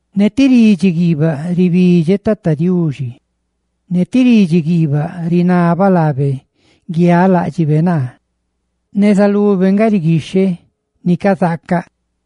Ne ti ridxi guiibaꞌ ribidxeꞌ Tata Diuxi, ne ti ridxi guiibaꞌ rinabaꞌ laabe guialáꞌdxibe naa. Neza lube nga riguixheꞌ ni cazaacaꞌ,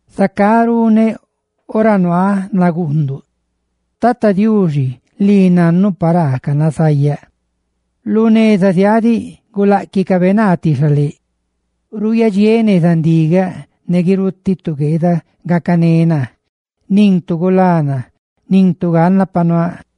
zacá runeꞌ ora nuaaꞌ naguunduꞌ. Tata Diuxi, lii nannuꞌ paraa canazayaꞌ: lu neza ziaaꞌ diꞌ, guláꞌquicabe naa ti xaléꞌ. Ruuyadxiéꞌ neza ndigaꞌ ne guirutiꞌ tu gueeda gacané naa. ¡Nin tu gulá naa! ¡Nin tu ganna pa nuaaꞌ!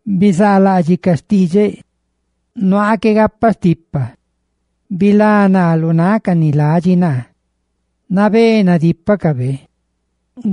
Bizaalaꞌdxiꞌ ca xtidxeꞌ, nuaaꞌ qué gapaꞌ stipa. Bilá naa lu náꞌ ca ni ladxi naa, purtiꞌ jma nadípacabe que naa.